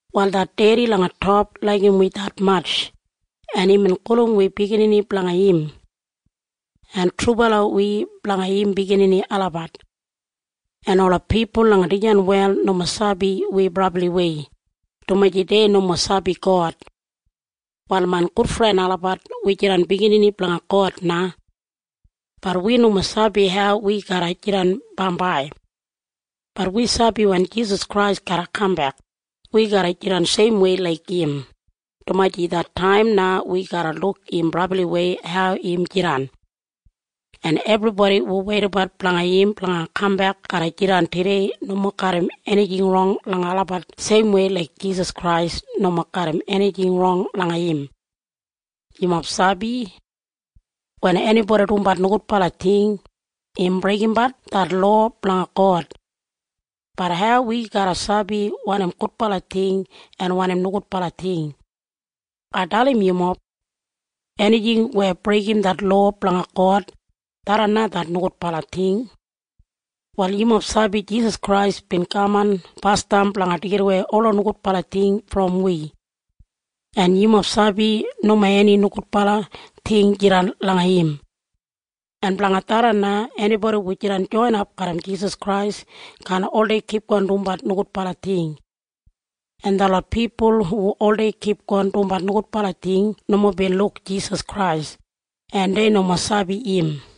Wal det Dedi langa top laigim wi detmatj, en imbin gulum wi biginini blanga im. En trubala wi blanga im biginini olabat. En ola pipul langa dijan wel nomo sabi wi brabliwei, dumaji dei nomo sabi God. Wal main gudfren olabat, wi jidan biginini blanga God na. Bat wi nomo sabi hau wi garra jidan bambai. Bat wi sabi wen Jisas Krais garra kambek, wi garra jidan seimwei laik im, dumaji det taim na wi garra luk im brabliwei hau im jidan. En ebribodi hu weidabat blanga im blanga kambek garra jidan tudei nomo garram enijing rong langa olabat seimwei laik Jisas Krais nomo garram enijing rong langa im. Yumob sabi? Wen enibodi dumbat nogudbala ting, im breigimbat det lowa blanga God. Bat hau wi garra sabi wanim gudbala ting en wanim nogudbala ting? Ai dalim yumob. Enijing weya breigim det lowa blanga God, tharran na det nogudbala ting. Wal yumob sabi Jisas Krais bin kaman basdam blanga deigidawei ola nogudbala ting brom wi. En yumob sabi nomo eni nogudbala ting jidan langa im. En blanga tharran na enibodi hu jidan joinap garram Jisas Krais kaan oldei kipgon dumbat nogudbala ting. En detlot pipul hu oldei kipgon dumbat nogudbala ting nomo bin luk Jisas Krais, en dei nomo sabi im.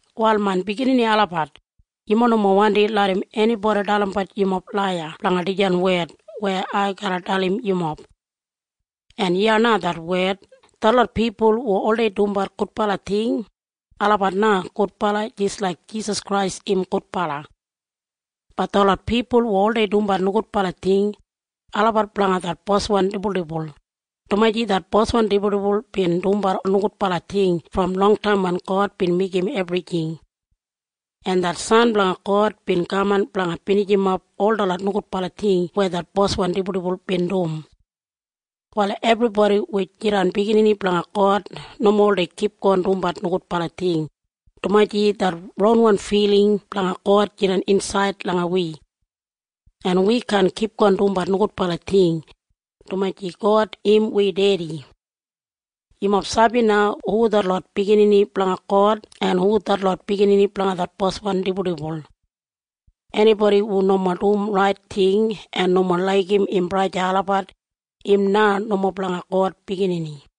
Wal main biginini olabat, yumob nomo wandi larram enibodi dalimbat yumob laiya blanga dijan wed weya ai garra dalim yumob. En iya na det wed. Detlot pipul hu oldei dumbat gudbala ting, olabat na gudbala jis laik Jisas Krais im gudbala. Bat detlot pipul hu oldei dumbat nogudbala ting, olabat blanga det boswan dibuldibul, dumaji det boswan dibuldibul bin dumbat nogudbala ting brom longtaim wen God bin meigim ebrijing. En det San blanga God bin kaman blanga binijimap ol detlot nogudbala ting weya det boswan dibuldibul bin dum. Wal ebribodi hu jidan biginini blanga God nomo oldei kipgon dumbat nogudbala ting, dumaji det ronwan filing blanga God jidan insaid langa wi. En wi kaan kipgon dumbat nogudbala ting, dumaji God im wi Dedi. Yumob sabi na hu detlot biginini blanga God en hu detlot biginini blanga det boswan dibuldibul? Enibodi hu nomo dum rait ting en nomo laigim im braja o sista olabat, im na nomo blanga God biginini.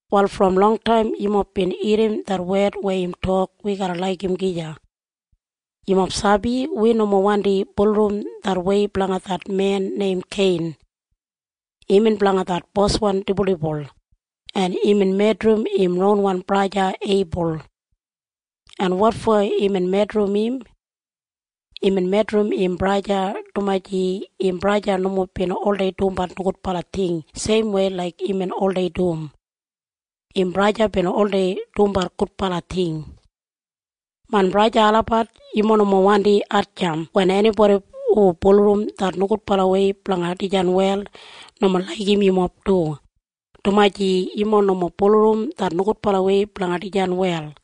Wal brom longtaim yumob bin irrim det wed weya im tok wi garra laigim gija. Yumob sabi? Wi nomo wandi bulurrum det wei blanga det men neim Kein. Imbin blanga det boswan dibuldibul, en imbin medrim im ronwan braja Eibul. En wotfo imbin medrim im? Imbin medrim im braja, dumaji im braja nomo bin oldei dumbat nogudbala ting seimwei laik imbin oldei dum. Im braja bin oldei dumbat gudbala ting. Main braja en sista olabat, yumob nomo wandi hatjamp wen enibodi hu bulurrum det nogudbalawei blanga dijan wel nomo laigim yumob du, dumaji yumob nomo bulurrum det nogudbalawei blanga dijan wel.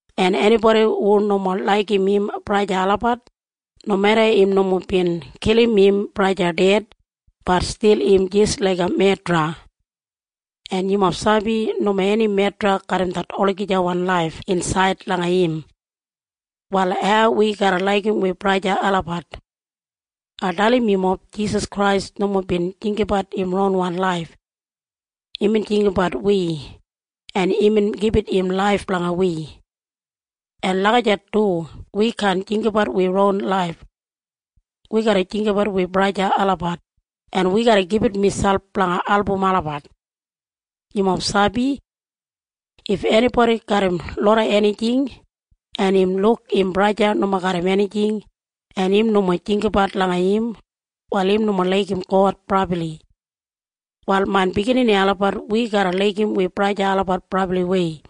En enibodi hu nomo laigim im braja o sista olabat, nomeda im nomo bin kilim im ded, bat stil im jis laiga medra. En yumob sabi nomo eni medra garram det olagijawan laif insaid langa im. Wal hau wi garra laigim wi braja en sista olabat? Ai dalim yumob. Jisas Krais nomo bin jinggabat im ronwan laif. Imbin jinggabat wi, en imbin gibit im laif blanga wi. En lagijat du wi kaan jinggabat wi ronwan laif. Wi garra jinggabat wi braja en sista olabat, en wi garra gibit miselp blanga album olabat. Yumob sabi? If enibodi garram loda enijing, en im luk im braja o sista nomo garram enijing, en im nomo jinggabat langa im, wal im nomo laigim God brabli. Wal main biginini olabat, wi garra laigim wi braja en sista olabat brabliwei.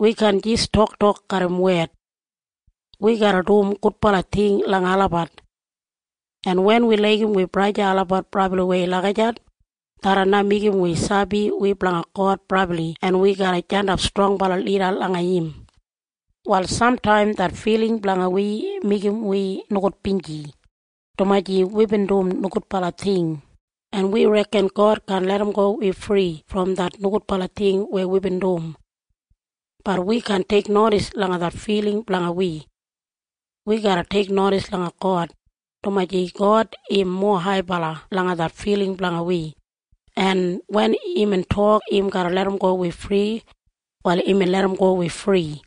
Wi kaan jis toktok garram wed. Wi garra dum gudbala ting langa olabat. En wen wi laigim wi braja en sista olabat brabliwei lagijat, tharran na meigim wi sabi wi blanga God brabli en wi garra jandap strongbala lida langa im. Wal samtaim det filing blanga wi meigim wi nogudbinji, dumaji wibin dum nogudbala ting, en wi reken God kaan larramgo wi fri brom det nogudbala ting weya wibin dum. Bat wi kaan teiknodis langa det filing blanga wi. Wi garra teiknodis langa God, dumaji God im mowa haibala langa det filing blanga wi, en wen imbin tok im garra larramgo wi fri, wal imbin larramgo wi fri.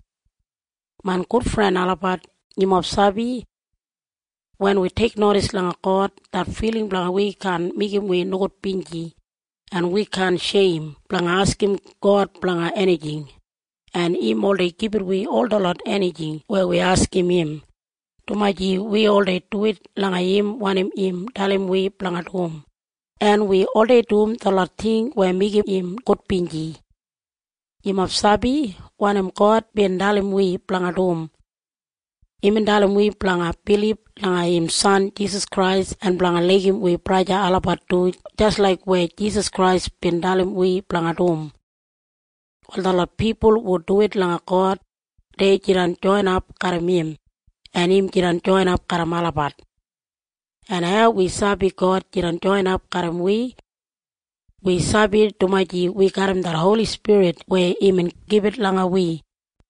Main gudfren olabat, yumob sabi? Wen wi teiknodis langa God, det filing blanga wi kaan meigim wi nogudbinji, en wi kaan sheim blanga askim God blanga enijing, en im oldei gibit wi ol detlot enijing weya wi askim im, dumaji wi oldei duwit langa im wanim im dalim wi blanga dum, en wi oldei dum detlot ting weya meigim im gudbinji. Yumob sabi wanim God bin dalim wi blanga dum? Imbin dalim wi blanga bilib langa im San Jisas Krais en blanga laigim wi braja en sista olabat du jis laik weya Jisas Krais bin dalim wi blanga dum. Wal detlot pipul hu duwit langa God, dei jidan joinap garram im, en im jidan joinap garram olabat. En hau wi sabi God jidan joinap garram wi? Wi sabi dumaji wi garram det Holi Spirit weya imbin gibit langa wi.